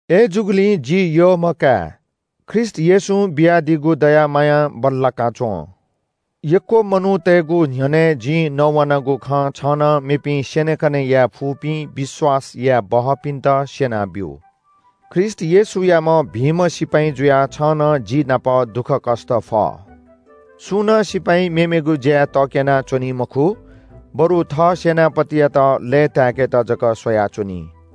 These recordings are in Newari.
अय्‌जूगुलिं जि यःम्‍ह काय्, ख्रीष्‍ट येशूं बियादीगु दया मायां बल्‍लाका च्‍वँ। यक्‍व मनूतय्‌गु न्‍ह्यःने जिं नवानागु खँ छं नं मेपिं स्‍यनेकने यायेफुपिं विश्‍वास याये बहःपिन्‍त स्‍यना ब्‍यु। ख्रीष्‍ट येशूयाम्‍ह भिंम्‍ह सिपाइँ जुयाः छं नं जि नाप दुःखकष्‍ट फ। सुं नं सिपाइँ मेमेगु ज्‍याय् तक्‍यनाच्‍वनी मखु, बरु थः सेनापतियात लय्‌ताय्‌केत जक स्‍वयाच्‍वनी।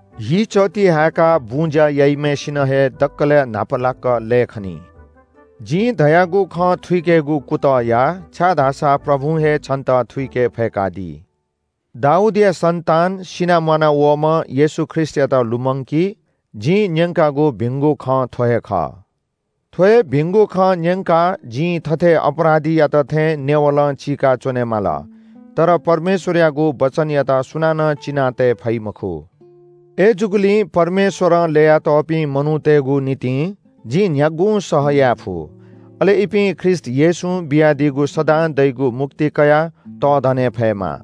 हिचःति हाय्‌काः बुँज्‍या याइम्‍हय्‌सिनं हे दकलय् न्‍हापालाक लये खनी। जिं धयागु खँ थुइकेगु कुतः या, छाय्‌धाःसा प्रभुं हे छन्‍त थुइके फय्‌कादी। दाऊदया सन्‍तान, सिनाः म्‍वानावःम्‍ह येशू ख्रीष्‍टयात लुमंकी। जिं न्‍यंकागु भिंगु खँ थ्‍व हे खः। थ्‍व हे भिंगु खँ न्‍यंकाः जिं थथे अपराधीयात थें नेवलं चिकाः च्‍वनेमाली। तर परमेश्‍वरयागु वचनयात सुनानं चिनातये फइ मखु। अय्‌जूगुलिं परमेश्‍वरं ल्‍ययातःपिं मनूतय्‌गु निंतिं जिं न्‍ह्यागुं सह याये फु। अले इपिं ख्रीष्‍ट येशूं बियादीगु सदां दइगु मुक्ति कयाः तःधने फयेमा।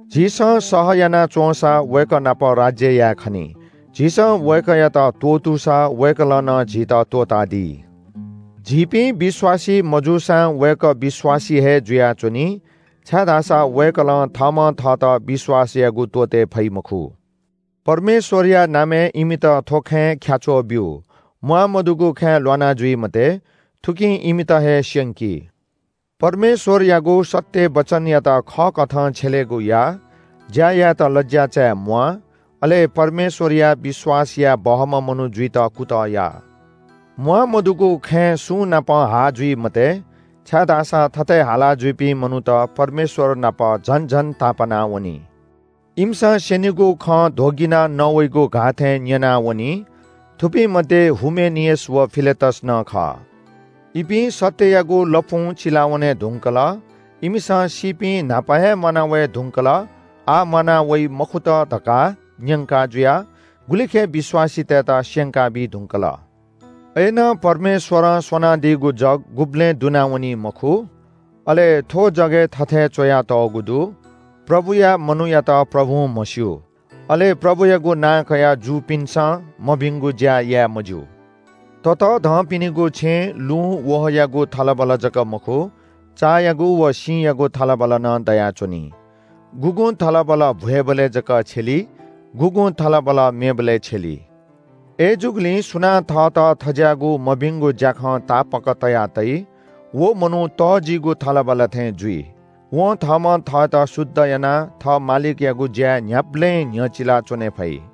झीसं सहयाना च्‍वंसा वय्‌कः नाप राज्‍य याये खनी। झीसं वय्‌कःयात त्‍वःतूसा वय्‌कलं नं झीत त्‍वःतादी। झीपिं विश्‍वासी मजूसां वय्‌कः विश्‍वासी हे जुयाच्‍वनी, छाय्‌धाःसा वय्‌कलं थःम्‍हं थःत विश्‍वास यायेगु त्‍वःते फइ मखु।” परमेश्‍वरया नामय् इमित थ्‍व खँय् ख्‍याच्‍वः ब्‍यु। म्‍वाःमदुगु खँय् ल्‍वाना जुइ मते, थुकिं इमित हे स्‍यंकी। परमेश्‍वरयागु सत्‍य वचनयात खःकथं छ्यलेगु या। ज्‍या यायेत लज्‍या चाये म्‍वाः। अले परमेश्‍वरया विश्‍वास याये बहःम्‍ह मनू जुइत कुतः या। म्‍वाःमदुगु खँय् सुंनाप हाः जुइ मते, छाय्‌धाःसा थथे हाला जुइपिं मनूत परमेश्‍वर नाप झन झन तापानावनी। इमिसं स्‍यनीगु खँ ध्‍वगिनाः नवइगु घाःथें न्‍यनावनी। थुपिं मध्‍ये हुमेनियस व फिलेतस नं खः। इपिं सत्‍ययागु लँपुं चिलावने धुंकल। इमिसं सीपिं न्‍हापा हे म्‍वाना वये धुंकल, आः म्‍वाना वइ मखुत धकाः न्‍यंका जुयाः गुलिखय् विश्‍वासीतय्‌त स्‍यंकाबी धुंकल। अय्‌नं परमेश्‍वरं स्‍वनादीगु जग गुबलें दुनावनी मखु। अले थ्‍व जगय् थथे च्‍वयातःगु दु – “प्रभुया मनूयात प्रभुं म्‍हस्‍यू।” अले “प्रभुयागु नां कयाः जूपिन्‍सं मभिंगु ज्‍या याये मज्‍यू।” ततःधंपिनिगु छेँय् लुँ, वहःयागु थलबल जक मखु, चायागु व सिँयागु थलबल नं दयाच्‍वनी। गुगुं थलबल भ्‍वय्‌बलय् जक छ्यली, गुगुं थलबल मेबलय् छ्यली। अय्‌जूगुलिं सुनां थःत थज्‍याःगु मभिंगु ज्‍याखं तापाक तया तइ, व मनू तःजिगु थलबल थें जुइ। वं थःम्‍हं थःत शुद्ध यानाः थः मालिकयागु ज्‍याय् न्‍ह्याबलें न्‍ह्यचिला च्‍वने फइ।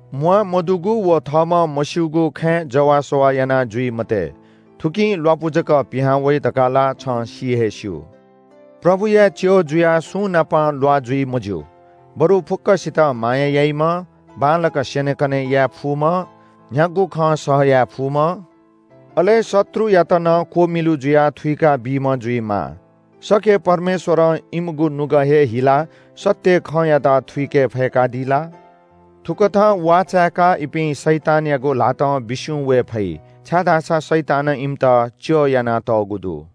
म्‍वाःमदुगु व थःम्‍हं मस्‍यूगु खँय् जवाःसवाः याना जुइ मते। थुकिं ल्‍वापु जक पिहां वइ धकाः ला छं सि हे स्‍यू। प्रभुया च्‍यः जुयाः सुंनाप ल्‍वाः जुइ मज्‍यू, बरु फुक्‍कसितं माया याइम्‍ह, बांलाक स्‍यनेकने याये फुम्‍ह, न्‍ह्यागु खं सह याये फुम्‍ह, अले शत्रुयात नं क्‍वमिलु जुयाः थुइका बीम्‍ह जुइमाः। सके परमेश्‍वरं इमिगु नुगः हे हिलाः सत्‍य खँयात थुइके फयेकादी ला? थुकथं वाः चायेकाः इपिं शैतानयागु ल्‍हातं बिस्‍युं वये फइ, छाय्‌धाःसा शैतानं इमित च्‍यः यानातःगु दु।